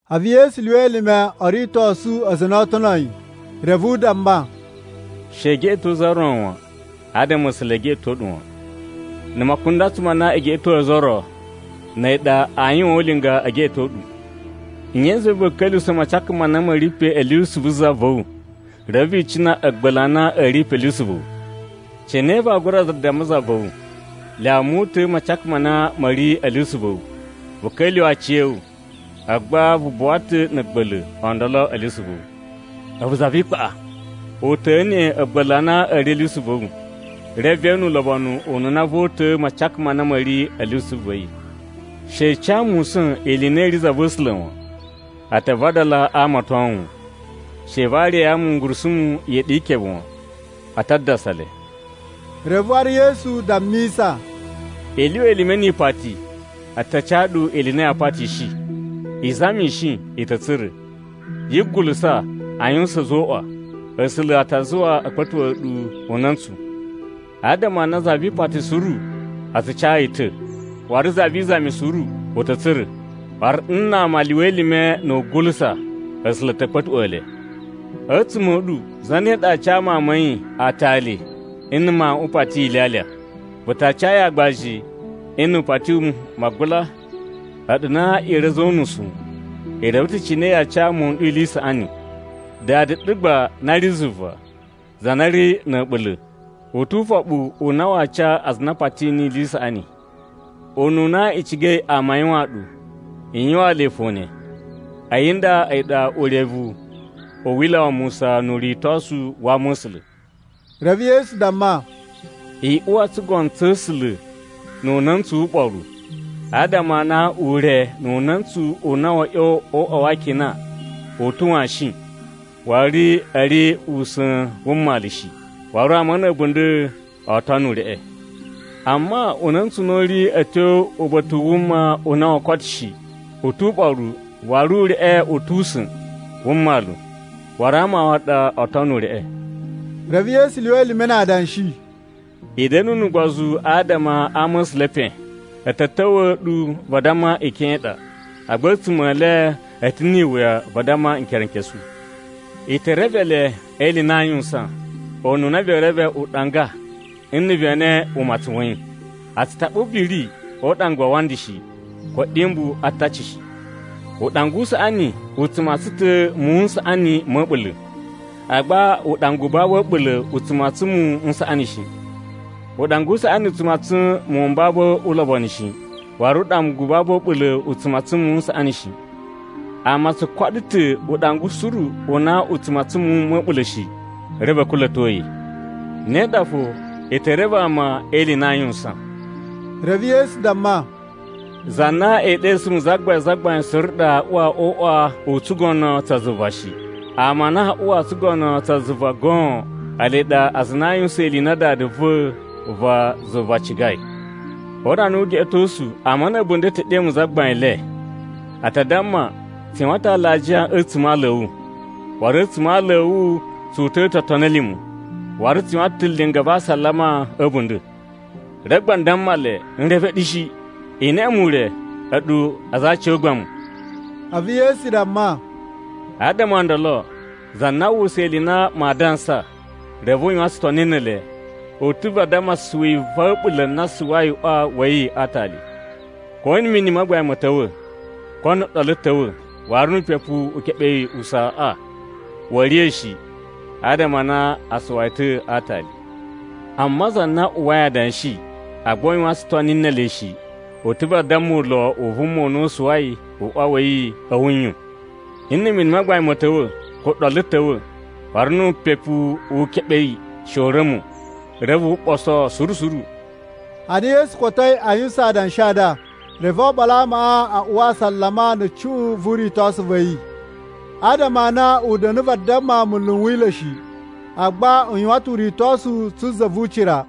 A̱vu Yesu lyuwa elime o ritosu aza a na oo tono yi, reve u damma, “She i geꞌeto za ro wan, adama A̱sula̱ e geꞌeto ɗu wan. Na̱ makundatsu ma na i geꞌetoi ozo o ro, na̱ a̱yi ɗa aa yuwaan ulinga e geꞌeto ɗu. “Nye i zuwai va̱a̱ ka̱nla̱sa̱ macaka ma na ma̱ ri pe a̱ lyusu vu za va̱ wu, reve vi icina na̱ a̱a̱gba̱la̱ a na a̱ ri pe a̱ lyusu va̱ wu? Cine vaa gura damma za va̱ wu, ‘Lyawa mu uta̱a̱ macaka ma na ma̱ ri a̱ lyusu va̱ wu?’ Vu ka̱lyuwa̱ aciya̱wu! A̱vu gba vu buwa ta̱ na̱ a̱a̱gba̱la̱ o ndolo a̱ lyusu va̱ wu. A̱vu za vi ikpaꞌa! Uta̱a̱ neꞌen a̱a̱gba̱la̱ a na a̱ ri a̱ lyusu va̱ wu, reve ve ene ulobonu ununa voo uta̱a̱ macaka ma na ma̱ ri a̱ lyusu va̱ yi. “She i ca musa̱n ili i na i ri za va̱ A̱sula̱ wan. A ta vadala aa amaton wu. She i variya ngurusumu iyeɗi yi ikebe wan. A ta dadasa le.” Reve waru Yesu dammisa, “I lyuwa elime ni ipati, a ta ca ɗu ili i na ya patishi. I zamishi, i ta̱ tsura̱. Yi gulusa a yuwusan ‘A̱zoꞌwa,’ A̱sula̱ a ta zuwa a̱ kpa̱tuꞌwa̱a̱ ɗu una̱ntsu. Adama a na za vi ipati suru a tsu ca yi ta̱. Waru za vi izami suru, u ta̱ tsura̱. Waru nna ama a lyuwa elime na̱ wugulusa, A̱sula̱ a̱ ta̱ kpa̱tuꞌwa̱a̱ le. “A̱tsuma̱ a̱ ɗu zane ɗa aa ca mawun ma̱ yi aatali, nna̱ mawuꞌun u pati yi ilyalya? Vu ta ca yi aagbaji, nna̱ u pati wu magula? A̱ɗu na i ri a̱za̱ o unusu, i reve ta̱ cine yaa ca muwun n ɗu ili i saꞌani. Dada ɗu gba na ri zuva, za na ri na̱ a̱ɓula̱, u tu ufoɓu u na waa ca aza a na a pati niyi ili i saꞌani! Ununa i cigai ama a yuwaan ɗu, i yuwaan le fo ne. A̱yi nda a̱yi ɗa urevu u Wila̱ wa Musa nu uritosu wa Ama̱sula̱.” Reve Yesu damma, “I uwa o tsugono tsa̱ A̱sula̱ nu una̱ntsu wu uɓoru. Adama a na ure nu una̱ntsu u na wa̱a̱ ꞌya̱wa̱ o uꞌwa wa akina a̱ ta̱ washin waru a̱ ri usa̱n wu mmalu shi, waru ama na̱ a̱bunda̱ oo tono ureꞌe. Amma una̱ntsu u na u ri a̱ tyo uba̱ta̱ u wuma u na woo koto shi, u tu uɓoru waru ureꞌe u tu usa̱n wu mmalu, waru ama waꞌa ɗa oo tono ureꞌe.” A̱vu Yesu lyuwa elime na adanshi, “I da̱nu nu ugbozu adama a ama̱sula̱ e epen. A̱ ta̱ ta̱wa̱ ɗu vadamma ikyon i ɗa, agba a̱tsuma̱ e le a̱ ta̱ ni iwuya vadamma nkerenkesu. I te reve le e ili i na aa yuwusan, ununa vee reve uɗanga nna̱ ve ene umatsun wa̱ yi. A̱ tsu taɓa ubiri o uɗanga wa awanda shi, ko a̱ɗyumbu a ataci shi. Uɗanga u saꞌani u tsu matsan ta̱ muwun n saꞌani ma̱ a̱ɓula̱, agba uɗanga u babu a̱ɓula̱ u tsu matsan muwun n saꞌani shi. Uɗanga u saꞌani u tsu matsan muwun m babu ulobonu shi, waru uɗanga u babu a̱ɓula̱ u tsu matsan muwun n saꞌani shi. Ama o tsu koɗo ta̱ uɗanga suru u na u tsu matsan muwun ma̱ a̱ɓula̱ shi, reve a̱ kula̱to yi. Ne ɗa fo, i te reve ama e ili i na aa yuwusan.” Reve Yesu damma, “Za na ee ɗesu mu Zagbain Zagbain suru ɗa aa uwa o uꞌwa u tsugono tsa zuva shi. Ama a na aa uwa o tsugono tsa zuva goon, ele ɗa aza a na aa yuwusan ili i na Dada va̱ va zuva cigai. O urana wu ugeꞌetosu ama na̱ a̱bunda̱ e te ɗe mu Zagbain le. A ta damma, ‘Tsu yuwan ta̱ alajiya a̱tsuma̱ a aala a̱ wu, waru a̱tsuma̱ a aala a̱ wu tsu uta̱a̱ ta̱ otoni a̱ lima̱, waru tsu yuwan ta̱ linga va asalama a̱ a̱bunda̱.’ Reve gba n damma le, ‘N reve ɗu shi. I neꞌe mu ure, a̱ɗu aza a aciyogbamu!’” A̱vu Yesu damma, “Adama o ndolo, za na aa uwwusa ili i na maa dansa, reve u yuwan tsutoni ne ele, u ta̱ vadamma suwi va̱ a̱ɓula̱ na suwai uꞌwa wa̱ yi a aatali. Ko na̱ mini ma gbain ma̱ ta̱wa̱, ko na̱ ɗolu ta̱wa̱, waru nu upepu u keɓe yi usaaꞌa, wa̱a̱ riya̱ shi, adama a na a suwa yi ta̱ a aatali. “Amma za na uwwai adanshi, agba u yuwan tsutoni ne ele shi, u ta̱ vadamma ulo u vuma u na u suwai uꞌwa wa̱ yi a̱ wuyun. Nna̱ mini ma gbain ma̱ ta̱wa̱, ko ɗolu ta̱wa̱, waru nu upepu u keɓe yi she u ra̱mo, reve wu ɓoso suru suru.” Ana Yesu kotoi a yuwusan adanshi a nda, reve oɓolo a amaꞌa a uwa asalama nu cuꞌun vu uritosu wa̱ yi. Adama a na u da̱na̱ vadamma munlu n Wila̱ shi, agba u yuwan ta̱ uritosu tsu za vu ucira.